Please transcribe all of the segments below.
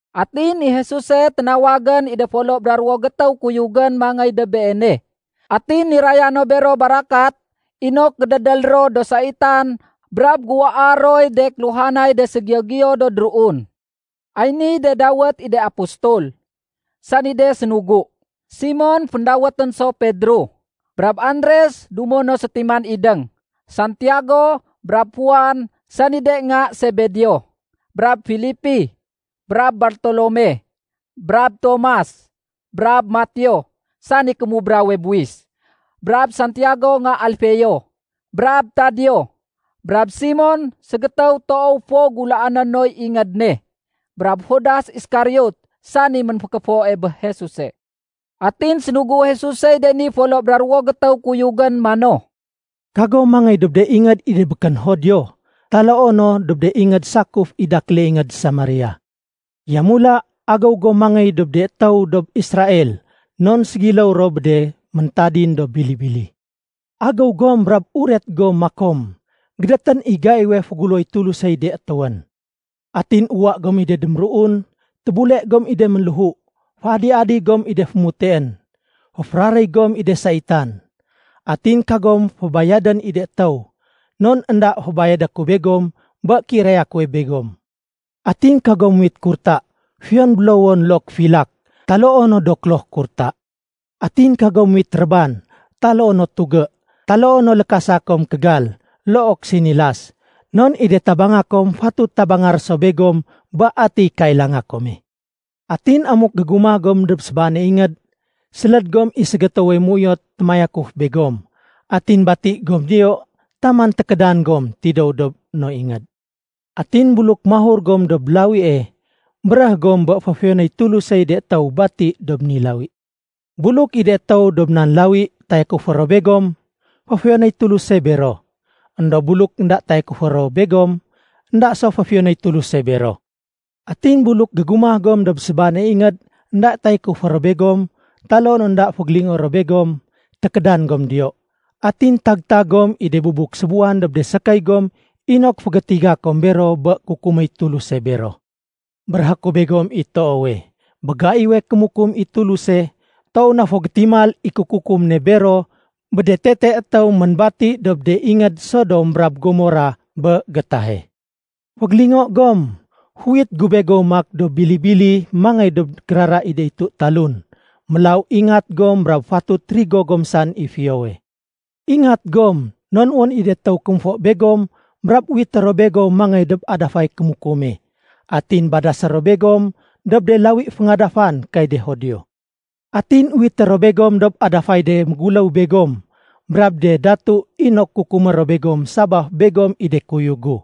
Atin i Jesuse ténawagén i de folo bra ruwo gétéw kuyugén mangéy dob Beene. Atin niraya no bero barakat inok gédédél ro do saitan brab géuwaa roy de kéluhanay de ségiyo-giyo do déruun. Ay niy de dawét i de Apostol, sani de sénugu: Simon (féndawétén so Pedro), brab Andres dumo no sétiman idéng, Santiago brab Juan sani de nga Sebedeo, brab Filipi, brab Bartolome, brab Tomas, brab Mateo sani kémubrawe buwis, brab Santiago nga Alfeo, brab Tadeo, brab Simon ségétéw toow fo gulaané noy ingéd ne, brab Judas Iskariot sani ménfékéfoe bé Jesuse. Atin sénugu Jesusey de ni folo bra ruwo gétéw kuyugén mano, “Kagom mangéy dob de ingéd i de békén Judio taloo no dob de ingéd sakuf i dakéle ingéd Samaria. Yamula, agéw gom mangéy dob de étéw dob Israel non ségiléw ro bé de méntadin do bili-bili. Agéw gom brab uret gom makom, ‘Gédétén i gaiwe féguléwoy Tulusey de étéwén.’ Atin uwa gom i de déméruun, tébule gom i de ménléhu, féadi-adi gom i de fémuteén, féféraréy gom i de saitan. Atin kagom fébayadén i de étéw, non énda fébayadé ku begom bé kéiraya kuwe begom. Atin kagom muwit kurta, fiyon bélowon look filak, taloo no do kloh kurta. Atin kagom muwit réban, taloo no tugé, taloo no lékasa kom kégal look sinilas. Non i de tabanga kom fatut tabanga ro so begom bé atiy kailanga kome. “Atin amuk gégumah gom dob sébaane ingéd, séléd gom i ségétéwe méuyot témayakuf begom. Atin bati gom diyo taman tékédan gom tidéw dob no ingéd. Atin buluk mahur gom dob lawie, béréh gom bé féfiyonéy Tulusey de étéw bati dob ni lawi. Buluk i de étéw dob nan lawi tayakufé ro begom, féfiyonéy Tuluse bero. Endob buluk énda tayakufé ro begom, énda so féfiyonéy Tuluse bero. Atin buluk gégumah gom dob sébaane ingéd énda tayakufé ro begom taloo no énda fégélingoé ro begom, tékédan gom diyo. Atin tag-tag gom i de bubuk sébuwan dob de sékéy gom inok fégétiga kom bero bé kukuméy Tuluse bero. Béréhé ku begom i toowe, bé gaiwe kémukum i Tuluse, toow na fo gétimal i kékukum ne bero bé de tete étéw ménbati dob de ingéd Sodom brab Gomorah bé gétahe. “Fégélingo gom, féuwit gu begom maak do bili-bili mangéy dob kérara i de itu talun. Mélaw ingat gom brab fatut rigo gom saén i fiyowe. Ingat gom non wén i de étéw kémfo begom brab uwité ro begom mangéy dob adafay kémukume. Atin badasé ro begom dob de lawi féngadafan kay de Judio. Atin uwité ro begom dob adafay de méguléw begom brab de datu inok kukumé ro begom sabaf begom i do kuyug gu.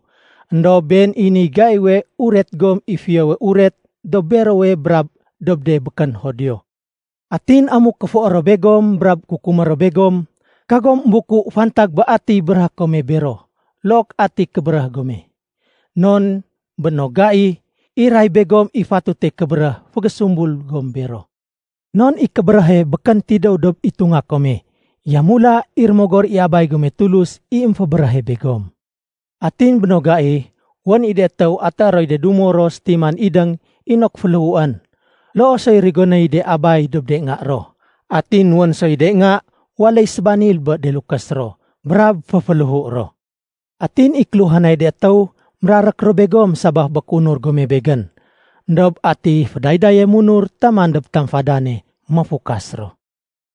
Endob been i niy gaiwe uret gom i Fiyowe Uret dob berowe brab dob de békén Judio. Atin amuk kéfoé ro begom brab kukumé ro begom, kagom émbuku fantag bé atiy béréhé kome bero look ati kébéréh gome. Non bé no gai, iray begom i fatute kébéréh fégésumbul gom bero. Non i kébéréhe békén tidéw dob itunga kome, yamula i Rémogor i Abay gome Tulus i émfébéréhe begom. “Atin bé no gai, wén i de étéw atéé roy de dumo ro sétiman idéng inok féléhuén. Loo soy rigonéy de abay dob de nga ro. Atin wén soy de nga waléy sébanil bé de lukés ro brab féféléhu ro. Atin i kéluhanay de étéw mérarék ro begom sabaf bé kéunur gome Begén. Endob ati fédaydaye munur taman dob tamfadane, méfukas ro.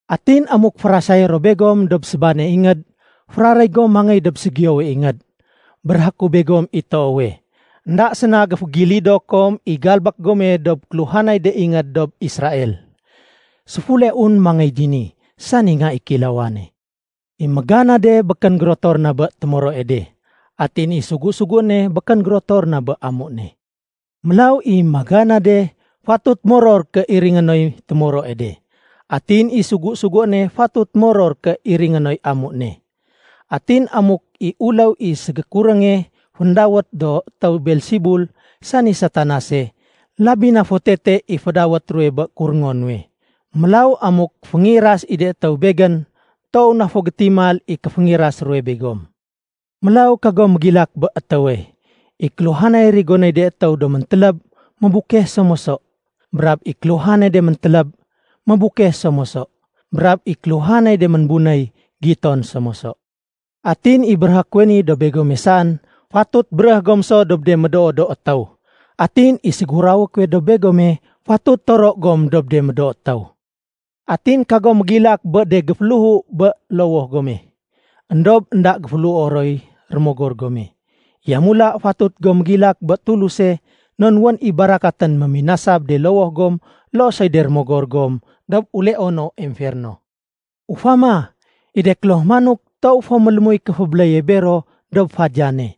Atin amuk férasayé ro begom dob sébaane ingéd, féraréy gom mangéy dob ségiyowe ingéd. Béréhé ku begom i toowe, énda séna géfégilido kom i galbék gome dob kéluhanay de ingéd dob Israel, séfuleun mangéy dini, sani Nga i Kéilawane. “I méganade békén gérotor na bé témoroe de. Atin i sugu-suguéne békén gérotor na bé amu ne. Mélaw i méganade fatut moror ké iringé noy témoroe de. Atin i sugu-suguéne fatut moror ké iringé noy amu ne. Atin amuk i uléw i ségékurénge féndawét do étéw Beelsebul sani Satanase, labi na fo tete i fédawét ruwe bé kuréngo nuwe. Mélaw amuk féngiras i de étéw Begén, toow na fo gétimal i kéféngiras ruwe begom. “Mélaw kagom mégilak bé étéwe. I kéluhanay rigonéy de étéw do méntéléb, mébukeh so moso. Brab i kéluhanay de méntéléb, mébukeh so moso. Brab i kéluhanay de ménbunéy, giton so moso. Atin i béréhé kuwe ni dob begome saén, fatut béréh gom so dob de médoo do étéw. Atin i ségurawé kuwe dob begome, fatut toro gom dob de médoo do étéw. Atin kagom mégilak bé de géféléhu bé lowoh gome, éndob énda géféléhuo roy rémogor gome. Yamula fatut gom mégilak bé Tuluse non wén i barakatén méminasa bé de lowoh gom loo soy de rémogor gom dob uleono emferno. Ufama, i de kloh manok toow fo mélémuy kéfébéléye bero dob fadiyane.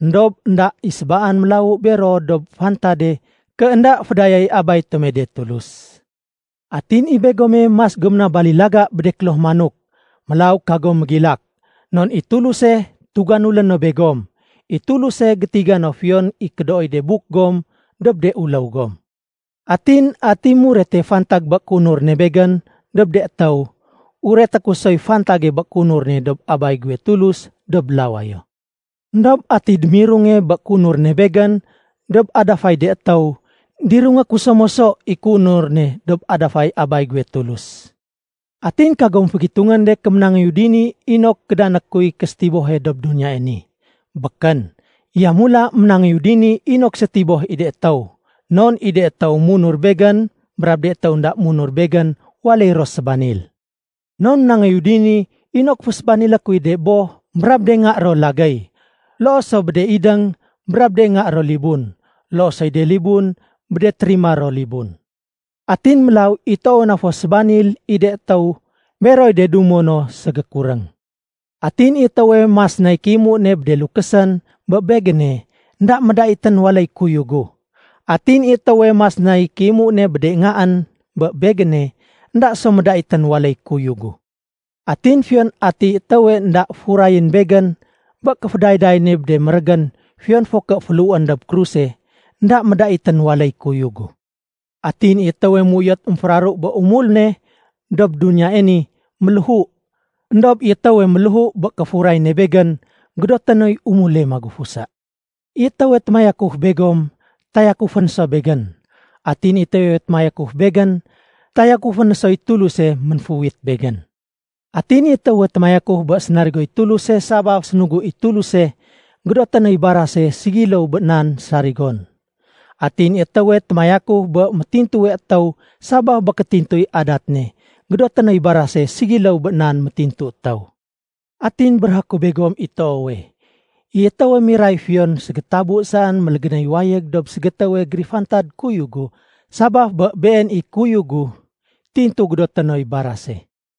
Endob énda i sébaan mélawu bero dob fantade ké énda fédayaéy Abay tome de Tulus. Atin i begome mas gom na balilaga bé de kloh manok. Mélaw kagom mégilak, non i Tuluse tuganulé no begom. I Tuluse gétiga no fiyon i kédooy de buk gom dob de uléw gom. “Atin ati murete fantag bé kéunur ne Begén dob de étéw, ureté ku soy fantage bé kéunur ne dob Abay guwe Tulus dob lawayo. Endob ati démirunge bé kéunur ne Begén dob adafay de étéw, dirungé ku so moso i kéunur ne dob adafay Abay guwe Tulus. “Atin kagom fégitungén de ké ménangéyu dini inok kédané kuy késétibohe dob duniyae ni. Békén. Yamula ménangéyu dini inok sétiboh i de étéw. Non i de étéw munur Begén brab de étéw énda munur Begén waléy ro sébanil. Non ménangéyu dini inok fésébanilé kuy de boh brab de nga ro lagéy. Loo so bé de idéng brab de nga ro libun. Loo soy de libun bé de térima ro libun. Atin mélaw i toowe na fo sébanil i de étéw, beroy de dumo no ségékuréng. “Atin i étéwe mas nay kéimu ne bé de lukésén bé Begéne, énda médaitén waléy kuyug gu. Atin i étéwe mas nay kéimu ne bé de ngaén bé Begéne, énda so médaitén waléy kuyug gu. Atin fiyon atiy étéwe énda furayén Begén bé kéfédayday ne bé de mérégén fiyon fo ké féléhuén dob kruse, énda médaitén waléy kuyug gu. Atin i étéwe méuyot émféraru bé umul ne dob duniyae ni, méléhu. Endob i étéwe méléhu bé kéfuray ne Begén, gédoté noy umule magufusa. “I étéwe témayakuf begom, tayakufé no so Begén. Atin i étéwe témayakuf Begén, tayakufé no soy Tuluse ménféuwit Begén. Atin i étéwe témayakuf bé sénarigoy Tuluse sabaf sénugu i Tuluse, gédoté noy barase ségiléw bé nan sarigon. Atin i étéwe témayakuf bé métintuwe étéw sabaf bé kétintuy adat ne, gédoté noy barase ségiléw bé nan métintu étéw. Atin béréhé ku begom i toowe, i étéwe miray fiyon ségétabu saén mélégénéy wayég dob ségétéwe gérifantad kuyug gu sabaf bé been i kuyug gu, tintu gédoté noy barase.”